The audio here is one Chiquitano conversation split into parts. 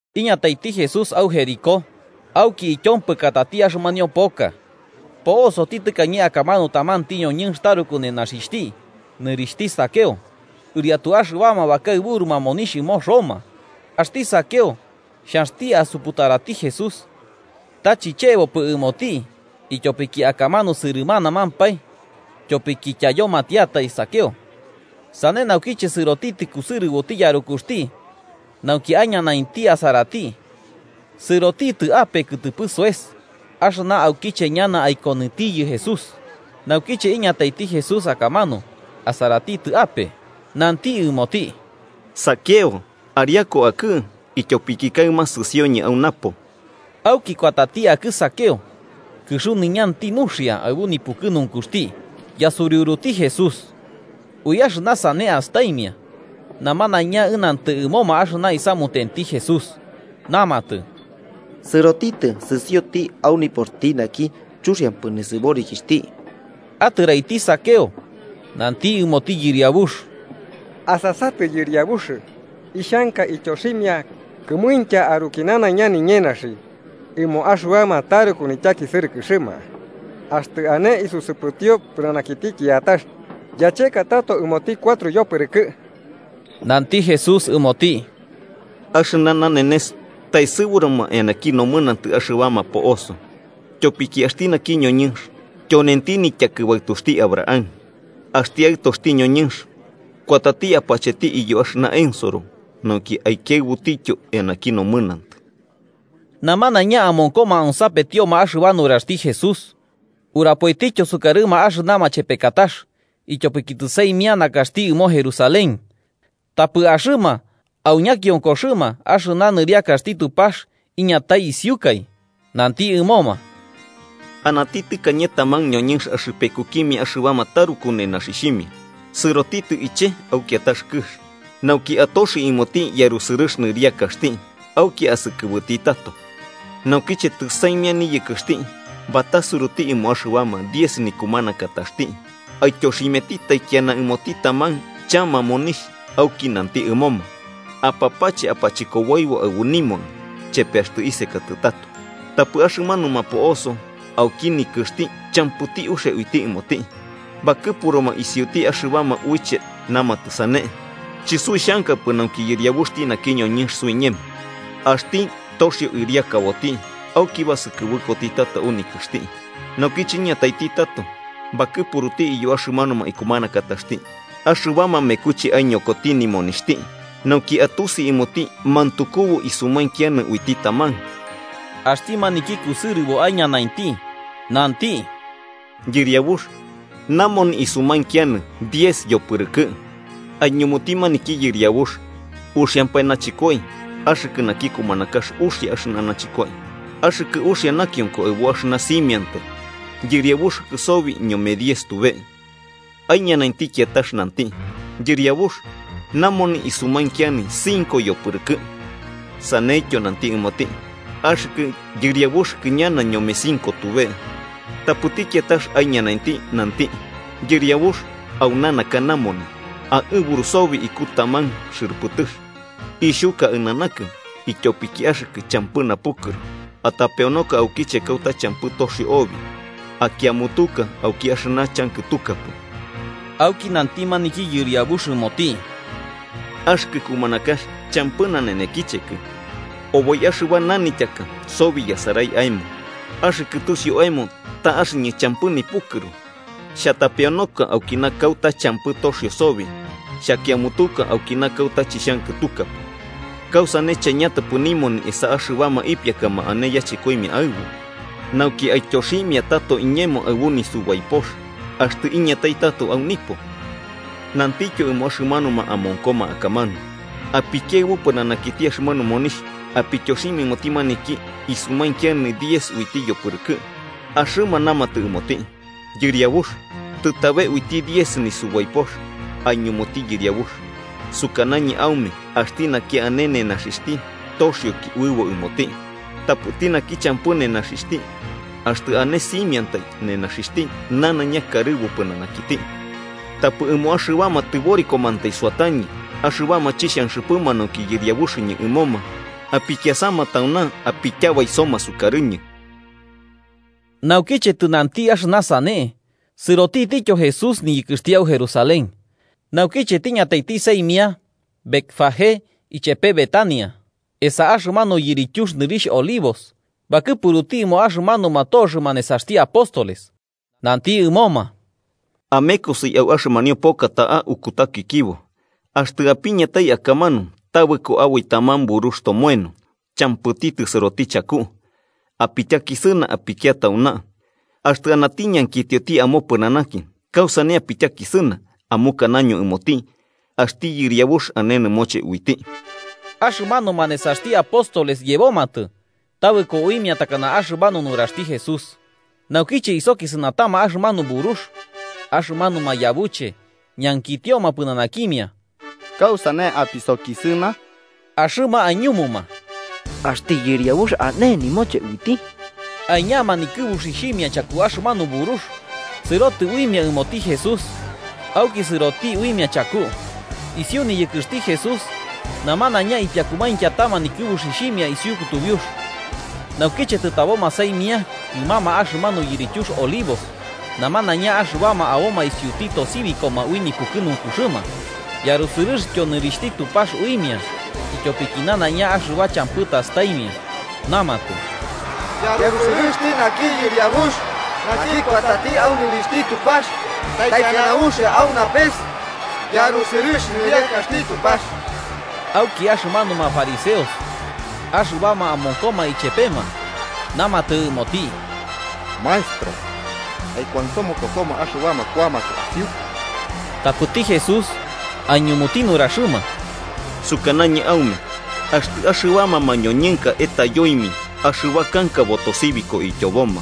Iñataiti Jesús au Jericó auki ityompɨkatati axɨmanio poka. Po'osoti tɨkañe akamanu tamanti ñoñɨnx taruku nenaxixhti nɨrixhti Zaqueo, ɨriatu axɨbama bakaɨburuma monixh ɨmo Roma. Axti Zaqueo xhanxti asuputarati Jesús, ta chichebopɨ ɨmoti ityopiki akamanu sɨrɨmanamampae tyopiki tyayomatiatai Zaqueo. Sane naukiche sɨrotitɨ kusɨrɨboti yarukuxti, nauki aiñanainti asarati, sɨrotitɨ ape kɨtɨpɨ soes axɨna aukiche ñana aikonɨtiyɨ Jesús. Naukiche iñataiti Jesús akamanu, asaratitɨ ape nanti ɨmoti: –Zaqueo, ariaku akɨ, ityopiki kaɨma sɨsioñɨ au napo. Auki kuatati akɨ Zaqueo kɨxuniñanti nuxia, aɨbu nipukɨnunkuxti yasuriuruti Jesús. Ui axɨna sane astaimia, namanaiña ɨnantɨ ɨmoma axɨna isamutenti Jesús, namatɨ ta sɨrotitɨ sɨsioti au nipoxti naki chuxiampɨ nisɨborikixhti. Atɨraiti Zaqueo nanti ɨmoti Yɨriabux: –Asasatɨ, Yɨriabux, ixhanka ityoximia kɨmuintya aruki nanaiña niñenaxi ɨmo axɨbama taruku nityakisɨrɨkɨxɨma. Axtɨ ane isusɨpɨtio pɨnanakiti kiatax, yacheka tato ɨmoti cuatro yopɨrɨkɨ. Nanti Jesús ɨmoti: –Axɨna nanenes taesɨburuma eanaki nomɨnantɨ axɨbama po'oso, tyopiki axti naki ñoñɨnx tyonenti nityakɨbaɨtuxti Abraham. Axti Aɨtoxti ñoñɨnx kuatati apacheti iyo axɨna ensoro nauki aikiaɨbutityo eanaki nomɨnantɨ. Namanaiña amonkoma onsapetioma axɨba nuraxti Jesús, urapoitityo sukarɨma axɨna machepekatax, ityopiki tɨsaimia nakaxti ɨmo Jerusalén tapɨ axɨma au ñakionkoxɨma axɨna nɨriakaxti Tupax iñatai isiukai. Nanti ɨmoma: “Anati tɨkañe taman ñoñɨnx axɨpekukimia axɨbama taruku nenaxixhimia, sɨrotitɨ iche'e au kiatax kɨx, nauki atoxi ɨmoti yarusɨrɨx nɨriakaxti auki asɨkɨbɨti tato. Naukiche tɨsaimia niyɨkɨxti, batasuruti ɨmo axɨbama diez nikumanakataxti, aityoximiati taikiana ɨmoti taman chama monixh auki nanti ɨmoma: ‘Apapache apachɨkoboibo aɨbu nimoni chepe axtɨ isekatɨ tato.’ Tapɨ axɨmanuma po'oso auki nikɨxti champɨti uxia uiti ɨmoti, bakɨpuruma isiuti axɨbama uiche namatɨ sane: ‘Chɨsuixhankapɨ nauki yɨriabuxti naki ñoñɨnx suiñemo.’ “Axti toxio ɨriakaboti, auki basɨkɨbɨkoti tato au nikɨxti. Naukiche iñataiti tato, bakɨpuruti iyo axɨmanuma ikumanakataxti axɨbama mekuche aiñokoti nimonixhti, nauki atusi ɨmoti mantukubu isumainkianɨ uiti taman. Axti maniki kusɨrɨbo aiñanainti nanti: ‘Yɨriabux, namoni isumainkianɨ diez yopɨrɨkɨ'ɨ.’ Aiñumuti maniki yɨriabux: ‘Uxiampae nachɨkoi. Axɨkɨ naki kumanakax uxia axɨna nachɨkoi. Axɨkɨ uxia nakionko aɨbu axɨna simiantai, yɨriabuxɨkɨ sobi ñome diez tube.’ Aiñanainti kiatax nanti: ‘Yɨriabux, namoni isumainkianɨ cinco yopɨrɨkɨ'ɨ.’ Saneityo nanti ɨmoti: ‘Axɨkɨ yɨriabuxɨkɨ ñana ñome cinco tube.’ “Tapɨti kiatax aiñanainti nanti: ‘Yɨriabux, auna naka namoni. Aɨburu sobi iku taman xɨrɨpɨtɨx. Ixhuka aɨnanakɨ, ityopiki axɨkɨ champɨ napukɨru, atapeonoka aukiche kauta champɨ toxio obi akiamutuka auki axɨna chankɨtukapɨ.’ Auki nanti maniki yɨriabux ɨmoti: ‘Axɨkɨ kumanakax champɨ nanenekichekɨ, oboi axɨba nanityaka sobi yasarai aemo. Axɨkɨ tusiu aemo ta axɨñɨ champɨ nipukɨru, xhatapeonoka aukina kauta champɨ toxio sobi xhakiamutuka aukina kauta chixhankɨtukapɨ, ¿kausane chaiñatapɨ nimoni esa axɨbama ipiakama ane yachɨkoimia aɨbu, nauki aityoximia tato iñemo aɨbu nisubaipox axtɨ iñatai tato au nipo?’ Nantityo ɨmo axɨmanuma amonkoma akamanu: ‘Apikiaɨbu pɨnanakiti axɨmanu monixh apityoximia ɨmoti maniki isumainkianɨ uiti diez yopɨpɨrɨkɨ'ɨ.’ Axɨma namatɨ ɨmoti: ‘Yɨriabux, ¡tɨtabe uiti diez nisubaipox!’ Aiñumuti yɨriabux: ‘Sukanañɨ aume axti naki ane nenaxixhti, toxioki uɨbo ɨmoti. Tapɨti naki champɨ nenaxixhti, axtɨ ane simiantai nenaxixhti nanaiña kaɨburu pɨnanakiti. Tapɨ ɨmo axɨbama tɨborikomantai suatañɨ axɨbama chixhanxɨpɨma nauki yɨriabuxɨñɨ ɨmoma, apikiasama tauna apityabaisoma sukarɨñɨ.’” Naukiche tɨnanti axɨna sane, sɨrotitityo Jesús niyɨkɨxti au Jerusalén. Naukiche tiñataiti saimia Betfagé ichepe Betania, esa axɨmanu yirityux nɨrixh Olivos, bakɨpuruti ɨmo axɨmanuma toxɨma nesaxti apóstoles, nanti ɨmoma: –Amekosi au axɨmanio poka ta'a ukutakɨkibo, axtɨ apiñatai akamanu tabɨko aboi taman burux tomoeno, champɨti tisɨroti chaku. Apityakisɨna apikia tauna. Axtɨ anati ñankitio amopɨnanaki kausane apityakisɨna, amukanaño ɨmoti axti Yɨriabux ane nɨmoche uiti. Axɨmanuma nesaxti apóstoles yebomatɨ tabɨko uimia takana axɨmanu nuraxti Jesús. Naukiche isokisɨnatama axɨmanu burux, axɨmanuma yabuche ñankitioma pɨnanakimia: –¿Kausane apisokisɨna? Axɨma aiñumuma: –Axti Yɨriabux ane nɨmoche uiti. Aiñama nikɨbuxixhimia chaku axɨmanu burux, sɨrotɨ uimia ɨmoti Jesús auki sɨroti uimia chaku. Isiu niyɨkɨxti Jesús, namanaiña ipiakumainkiatama nikɨbuxixhimia isiu kutubiux. Naukiche tɨtaboma saimia kɨmama axɨmanu yirityux Olivos, namanaiña axɨbama aboma isuti tosibikoma ui nipukɨnunkuxɨma yarusɨrɨxtyo nɨrixhti Tupax uimia ityopiki nanaiña axɨba champɨ tastaimia. Namatɨ: –¡Yarusɨrɨxti naki yɨriabux naki kuatati au nɨrixhti Tupax! ¡Taikiana uxia au napes yarusɨrɨx nɨriakaxti Tupax! Auki axɨmanuma fariseos axɨbama amonkoma ichepema namatɨ ɨmoti: –Maestro, aikuansomokosoma axɨbama kuamatɨ asiukɨ. Tapɨti Jesús aiñumuti nuraxɨma: –Sukanañɨ aume axtɨ axɨbama mañoñɨnaka etayoimia, axɨba kanka botosibiko ityoboma.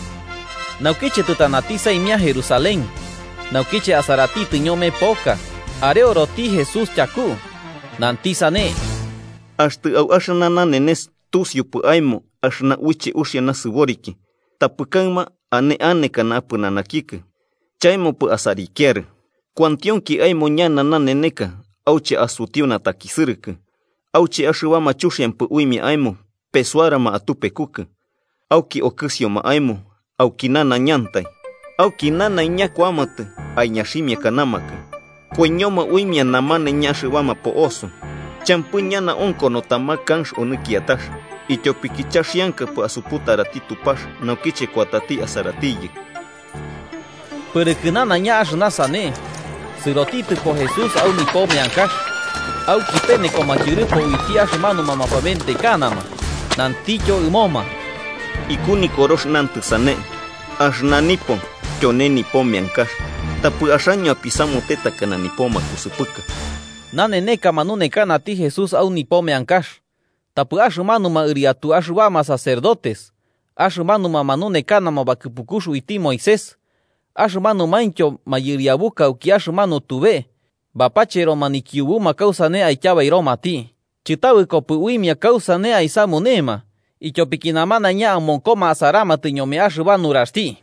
Naukiche tɨtanati saimia Jerusalén, naukiche asaratitɨ ñome poka, areoroti Jesús tyaku, nanti sane: “¡Axtɨ au axɨna nanenes tusiupɨ aemo axɨna uiche uxia nasɨboriki! Tapɨ kaɨma ane anekana apɨnanakikɨ chaemopɨ asarikiarɨ. Kuantionki aemo ñana naneneka auche asutiu natakisɨrɨkɨ, auche axɨbama chuxiampɨ uimia aemo pesuarama atupekukɨ, auki okɨsioma aemo auki nanaiñantai, auki nanaiña kuamatɨ aiñaximiakanamakɨ. Koiñoma uimia namanaiña axɨbama po'oso, champɨ ñana onkono taman kanx onɨ kiatax, ityopiki chaxiankapɨ asuputarati Tupax naukiche kuatati asaratiyɨ.” Pɨrɨkɨ nanaiña axɨna sane, sɨrotitɨpo Jesús au nipo meankax auki penekoma tyɨrɨpo uiti axɨmanuma mapaventekanama, nantityo ɨmoma: –Iku Nikorox nantɨ sane: ‘Axɨna nipo tyone nipo meankax’, tapɨ axaño apisamute takana nipo makusɨpɨka. Naneneka manunekanati Jesús au nipo meankax, tapɨ axɨmanuma ɨriatu axɨbama sacerdotes, axɨmanuma manunekanama bakɨpukux uiti Moisés axɨmanumaintyo mayɨriabuka auki axɨmanu tube bapacheroma nikiubuma kausane aityabairomati. Chɨtabɨkopɨ uimia kausane aisamunema, ityopiki namanaiña amonkoma asaramatɨ ñome axɨba nuraxti.